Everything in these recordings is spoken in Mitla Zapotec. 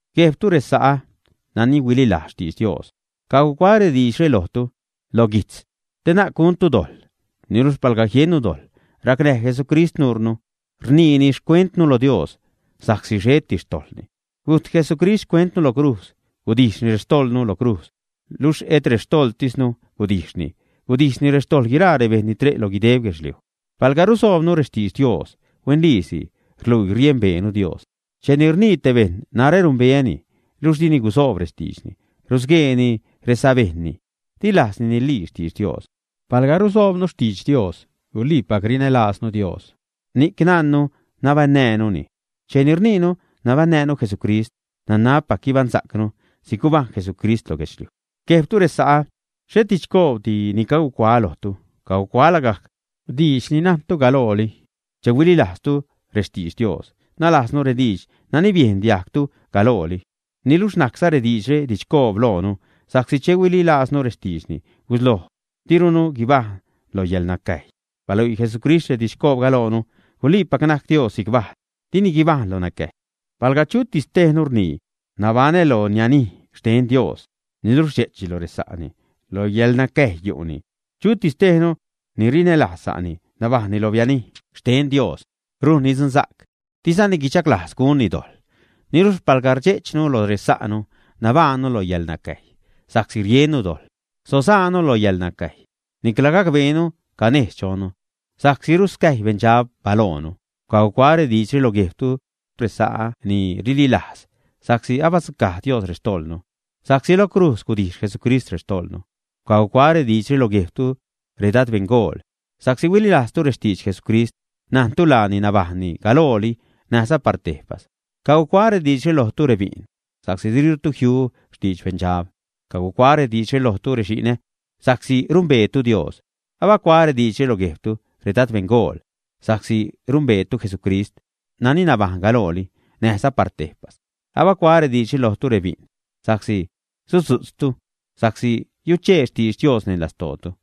Guejbtu, resa'ä nani huililajz xtidx Dios, cagucuaä rediidxre lojtu lo guijtz te na'c guntu dojḻ. Niluxh palga jiennu dojḻ, racnäj Jesucrist nuunu, rniini xcuentnu lo Dios, sa'csi xheti xtojḻni. Gujt Jesucrist xcuentnu lo crujz. Gudijxni rextojḻnu lo crujz. Luxh et rextojḻtisnu gudijxni. Gudijxni rextojḻ guiraa rebejṉ ni ṟe' lo guideb guedxliuj. Palga rusoobnu rextidx Dios, huenliisi rluii riembeenu Dios. Cheni rnii te bejṉ, “narä rumbeäni”, niluxh dini gusoob rextiidxni, rusgueeni resabejṉni. Di lajzni nilii xtidx Dios. Palga rusoobnu xtidx Dios, guliipac rinälaaznu Dios, ni'c najnnu nabaṉnäjnuni. Cheni rniinu nabaṉnäjnu Jesucrist, nanabpac guibaṉsa'cnu si'c gubajṉ Jesucrist lo guedxliuj. Guejbtu resa'ä, xhet didxcoobdi ni cagucuaä lojtu. Cagucuaä lagajc diidx ni najntu galooli che huililajzlitu rextidx Dios, nalajznu rediidx nani biejn diajgtu galooli. Niluxh najcza rediidxre didxcoob loonu, sa'csi che huililajznu rextiidxni gusloj dirunu guibajṉ lo yäḻnacäjy. Baluii Jesucrist redidxcoobga loonu. Guliipac najc Dios si'c bajl. Dini guibajṉ lo nacäjy. Palga chutis tejnu rnii, “nabaṉä lo nianij xten Dios”, niluxh rdxe'chni lo resa'ni, lo yäḻnacäjy yu'ni. Chutis tejnu ni rinälajz sa'ni, nabajṉni lo bianij xten Dios, rujnni dzunsa'c, dizani guichaglajz gunni dojḻ. Niluxh palga rdxe'chnu lo resa'nu, nabajṉnu lo yäḻnacäjy sa'csi riennu dojḻ, sasaanu lo yäḻnacäjy. Nicla gacbeenu canejz chonnu, sa'csi ruscäjy beṉdxab balojnu. Cagucuaä rediidxre lo guejbtu, resa'ä ni rililajz, sa'csi abadzucaj Dios rextojḻnu, sa'csi lo crujz gudijx Jesucrist rextojḻnu. Cagucuaä rediidxre lo guejbtu, redad beṉgool, sa'csi huililajztu rextidx Jesucrist, najntu laani nabajṉni galooli näjza par tejpas. Cagucuaä rediidxre lojtu, rebi'n sa'csi dirutu jiu xtidx beṉdxab. Cagucuaä rediidxre lojtu rexi'nä, sa'csi rumbeetu Dios. Abacuaä rediidxre lo guejbtu, redad beṉgool, sa'csi numbeetu Jesucrist nani nabajṉ galooli näjza par tejpas. Abacuaä rediidxre lojtu rebi'n, sa'csi sudzu'tztu, sa'csi yuchee xtidx Dios neṉ lastootu,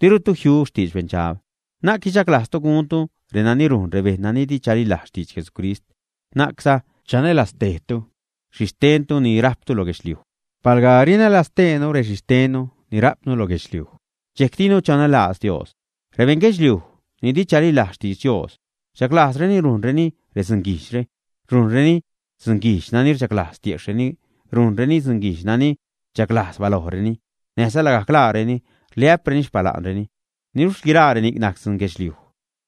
dirutu jiu xtidx beṉdxab. Na'c guichaglajztu guntu renani rujn rebejṉ nani di chalilajz xtidx Jesucrist; na'cza chanälaztejtu xhixtentu ni rajptu lo guedxliuj. Palga rinälaztejnu rexhixtenni ni ra'pnu lo guedxliuj, dxejc dinu chanälajz Dios. Rebeṉ guedxliuj ni di chalilajz xtidx Dios rchaglajzreni rujnreni redzunguijdxre: rujnreni dzunguijdx nani rchaglajz tiejxhreni; rujnreni dzunguijdx nani rchaglajz balojreni, näjza lagajc laareni rliä'preni xpala'nreni. Niluxh guiraa reni'c najc dzun guedxliuj,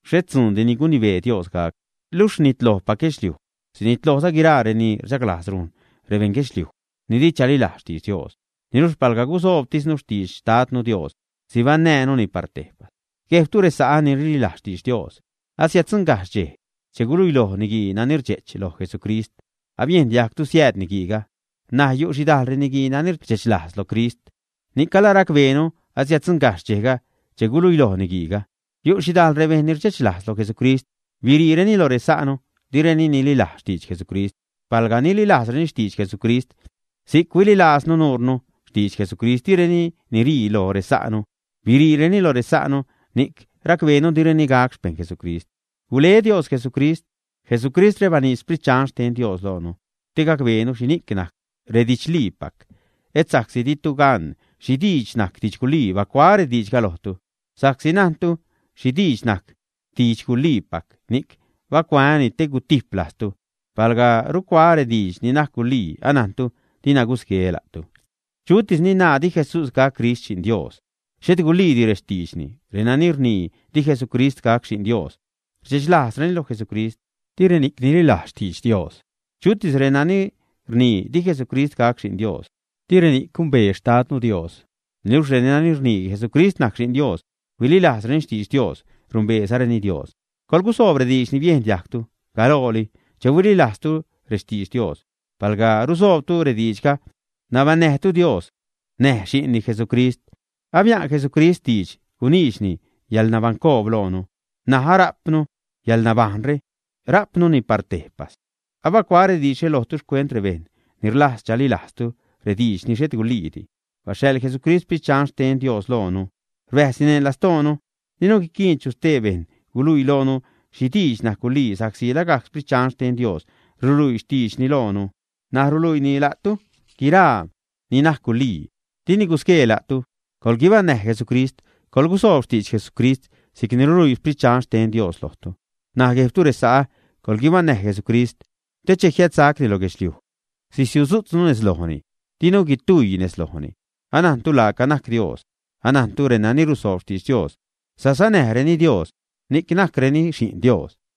xhet dzuundi ni gunibee Dios gac. Luxh rnitlojpac guedxliuj. Sinitlojza guiraa reni rchaglajz rujn rebeṉ guedxliuj ni di chalilajz xtidx Dios. Niluxh palga gusoobtisnu xtidx Xtadnu Dios, sibaṉnäjnuni par tejpas. Guejbtu resa'ä ni rililajz xtidx Dios, asiäddzuṉgajxh dxej che guluiloj niguii nani rdxe'ch loj Jesucrist. Abiejn diajgtu siääd niguiiga. N̲aj yu' xhidajl reniguii nani rdxechlajz lo Crist. Ni'c alaracbeenu asiäddzuṉgajxh dxejga che guluiloj niguiiga. Yu' xhidajl rebejṉ ni rdxechlajz lo Jesucrist. Biriireni lo resa'nu. Direni nililajz xtidx Jesucrist. Palga nililajzreni xtidx Jesucrist si'c huililaaznu nuure xtidx Jesucrist, direni nirii lo resa'nu. Biriireni lo resa'nu, ni'c racbeenu direni gac xpejṉ Jesucrist. Gule Dios Jesucrist. Jesucristre baniidx Sprit Dxan xten Dios loonu te gacbeenu xhini'c najc redidxliipac. Et sa'csi ditu gan xhi diidx najc didx gulii bacuaä rediidxga lojtu. Sa'csi najntu xhi diidx najc didx guliipac, ni'c bacuaäni, te gutijp lajztu. Palga rucuaä rediidx ni najc gulii, anajntu dina gusgueä la'tu. Chutis ni naa di Jesús gac Crist Xi'n Dios, xhet guliidi rextiidxni. Renani rnii di Jesucrist gac Xi'n Dios rdxechlajzni lo Jesucrist. Di reni'c nililajz xtidx Dios. Chutis reni rnii di Jesucrist gac Xi'n Dios, di reni'c gumbee xtadnu Dios. Niluxh renani rnii Jesucrist najc Xi'n Dios, huililajzreni xtidx Dios, numbeezareni Dios. Coḻgusoob rediidx ni biejn diajgtu galooli che huililajztu rextidx Dios. Palga rusoobtu rediidxga, nabaṉnäjtu Dios näj xi'nni Jesucrist. Abia'n Jesucrist diidx guniidxni yäḻnabaṉcoob loonu. N̲aj ara'pnu yäḻnabajṉre, ra'pnuni par tejpas. Abacuaä rediidxre lojtu xcuent rebejṉ ni rlajz chalilajztu rediidx ni xhet guliidi. Baxhaḻ Jesucrist Sprit Dxan xten Dios loonu. Rbäjzni neṉ lastoonu. Dinu guiquiin chu stee bejṉ guluii loonu xhi diidx najc gulii, sa'csi lagajc Sprit Dxan xten Dios ruluii xtiidxni loonu. N̲aj ruluiini la'tu guiraa ni najc gulii, dini gusguee la'tu. Coḻguibaṉnäj Jesucrist; coḻgusoob xtidx Jesucrist si'cni ruluii Sprit Dxan xten Dios lojtu. N̲aj guejbtu resa'ä, coḻguibaṉnäj Jesucrist, te che jiädsacni lo guedxliuj sisiutzu'tznu nejz lojni, dinu guitujy nejz lojni. Anajntu laaca najc Dios. Anajntu renani rusoob xtidx Dios sasanäjreni Dios, ni'c najcreni xi'n Dios.